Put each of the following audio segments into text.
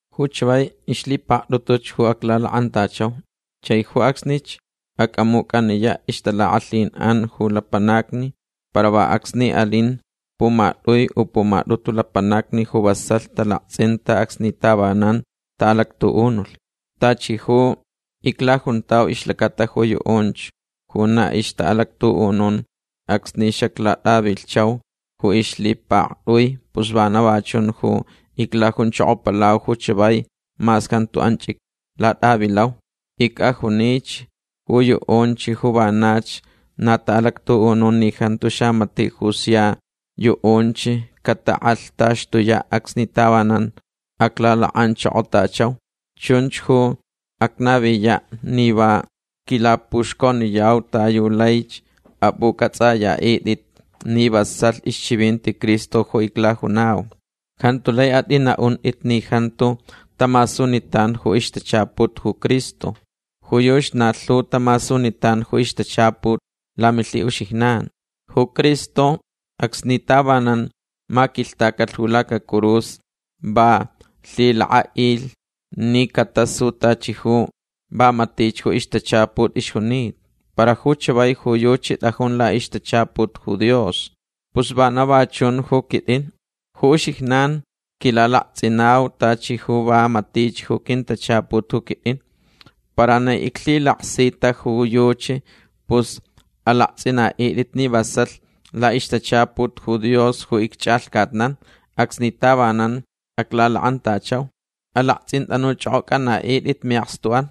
Ju chavai ixlhipaktʼutuch ju aclalakʼantachauch. Chai ju acsnich acʼamucʼaniyaʼ ixtalakʼalhinʼan ju lapanacni para va acsni alin pumatʼui u pumatʼutu lapanacni ju vasalh talaktsʼinta acsni tavanan taʼalactuʼunulh. Tachi ju iclajuntau ixlacata ju yuʼunch ju na ixtaʼalactuʼunun acsni xaclatʼavilhchau ju ixlhipaktʼui pus vana va chun ju iclajunchokopalau ju chavai mas jantu anch iclatʼavilau. Icʼajunich ju yuʼunch ju vanach na taʼalactuʼunun ni jantu xamatiʼ ju sia yuʼunch catakʼalhtaxtuyaʼ acsni tavanan aclalakʼanchokotachau. Chunch ju acnaviyaʼ ni va quilapuxconiyau ta yu laich apʼucʼatsʼayaʼitʼit ni vasalh ixchivinti Cristo ju iclajunau. Jantu lai atʼinaʼuntʼit ni jantu tamasunitan ju ixtachaput ju Cristo. Ju yuchi na lhu tamasunitan ju ixtachaput lamilhiʼuxijnan. Ju Cristo acsni tavanan maquilhtacalh ju lacacurus va lhilakʼaʼilh ni catasu tachi ju va matich ju ixtachaput ixjunita. Para ju chavai ju yuchi tʼajun laʼixtachaput ju Dios. Pus vana va chun ju quitʼin. Ju uxijnan quilalaktsʼinau tachi ju va matich ju quintachaput ju quitʼin. Para ni iclhilaksita ju yuchi pus alaktsʼinaʼitʼit ni vasalh laʼixtachaput ju Dios ju icchʼalhcatnan acsni tavanan aclalakʼantachau. Alaktsʼintʼanuchʼokʼocʼantʼit miʼakstuʼan.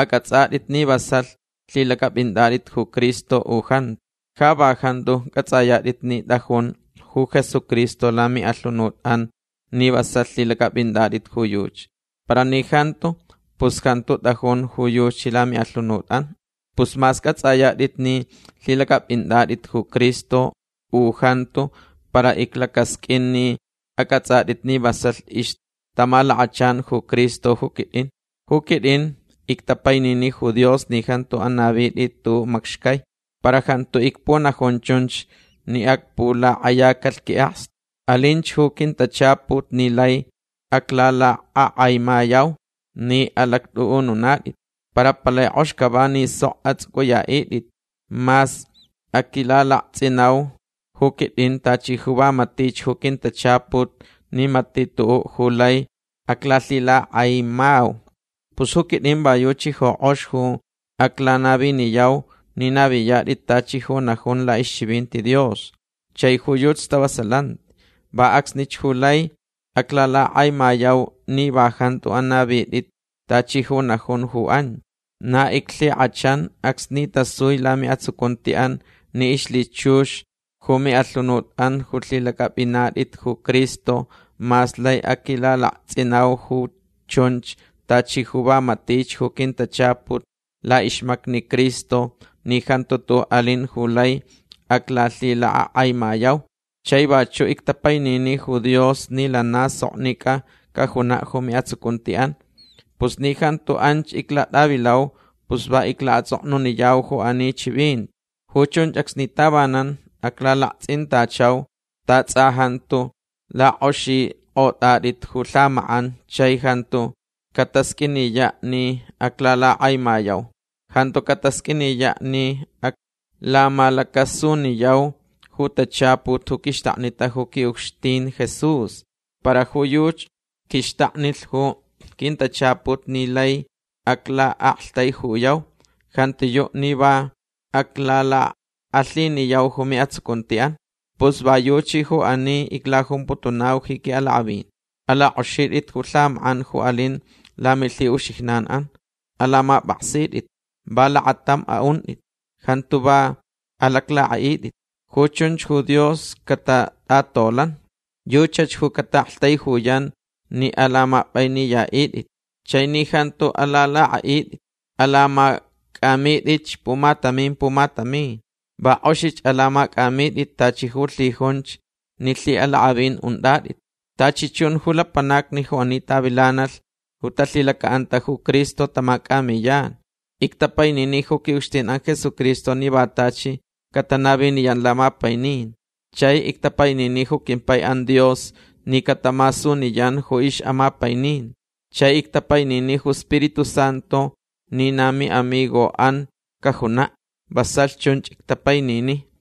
Acʼatsʼatʼit ni vasalh lhilacʼapʼinatʼit ju Cristo u jantu. Ja va jantu cʼatsʼayatʼit ni tʼajun ju Jesucristo lamiʼalhunutʼan ni vasalh lhilacʼapʼinatʼit ju yuchi. Para ni jantu pus jantu tʼajun ju yuchi lamiʼalhunutʼan. Pus mas cʼatsʼayatʼit ni lhilacʼapʼinatʼit ju Cristo u jantu para iclacasqʼuin ni acʼatsʼatʼit ni vasalh ixtamalakachan ju Cristo ju quitʼin. Ju quitʼin ictapainini ju Dios ni jantu anavitʼit tuʼuʼ macxcai. Para jantu icpunajun chunch ni acpulakʼayacalh quiʼakstu. Alinch ju quintachaput ni laich aclalakʼakʼaimayau ni alactʼuʼununatʼit. Para palai kʼox cava ni sok atsʼucʼuyaʼitʼit mas aquilalaktsʼinau ju quitʼin tachi ju va matich ju quintachaput ni matiʼ tuʼuʼ ju lai aclalhilakʼakʼaimau. Pus ju quitʼin va yuchi ju kʼox ju aclanaviniyau ni naviyatʼit tachi ju najun laʼixchivinti Dios. Chai ju yuchi stavasalanti. Va acsnich ju lai aclalakʼakʼaimayau ni va jantu anavitʼit tachi ju najun ju anch. Na iclhikʼachan acsni tasui lamiʼatsucuntiʼan ni ixlhichux ju miʼalhunutʼan ju lhilacʼapʼinatʼit ju Cristo mas lai aquilalaktsʼinau ju chunch tachi ju va matich ju quintachaput laʼixmacni Cristo ni jantu tuʼuʼ alin ju lai aclalhilakʼakʼaimayau. Chai vachuʼ ictapainini ju Dios ni lana soknicʼa cajunaʼ ju miʼatsucuntiʼan. Pus ni jantu anch iclatʼavilau pus va iclaʼatsʼoknuniyau ju ani chivinti. Ju chunch acsni tavanan aclalaktsʼintachau ta tsʼa jantu lakʼoxikʼotʼatʼit ju lhamakʼan chai jantu catasqʼuiniyaʼ ni aclalakʼakʼaimayau. Jantu catasqʼuiniyaʼ ni aclamalacasuniyau ju tachaput ju quixtaknita ju quiʼucxtin Jesús. Para ju yuchi quixtaknilh ju quintachaput ni laich aclaʼaktaijuyau. Jantiyuʼ ni va aclalakʼalhiniyau ju miʼatsucuntiʼan. Pus va yuchi ju ani iclajumputunau ji quiʼalakʼavin. Alakʼoxitʼit ju lhamakʼan ju alin lamilhiʼuxijnanʼan. Alamapʼaksitʼit. Va lakatam aʼuntʼit. Jantu va alaclakʼaʼitʼit. Ju chunch ju Dios catatʼatolanch. Yuchach ju cataʼaktaijuyan ni alamapʼainiyaʼitʼit chai ni jantu alalakʼaʼitʼit. Alamacʼamitʼitch pumatamin pumatamin. Va kʼoxich alamacʼamitʼit tachi ju lhijunch ni lhiʼalakʼavin untʼatʼit. Tachi chun ju lapanacni ju ani tavilanalh ju talhilacaʼanta ju Cristo tamacʼamiyan. Ictapainini ju quiʼucxtinʼan Jesucristo ni va tachi catanaviniyan lamapainin. Chai ictapainini ju quimpaiʼan Dios ni catamasuniyan ju ixʼamapaininti. Chai ictapainini ju Spiritu Santu ni na miʼamigoʼan cajunaʼ. Vasalh chunch ictapainini.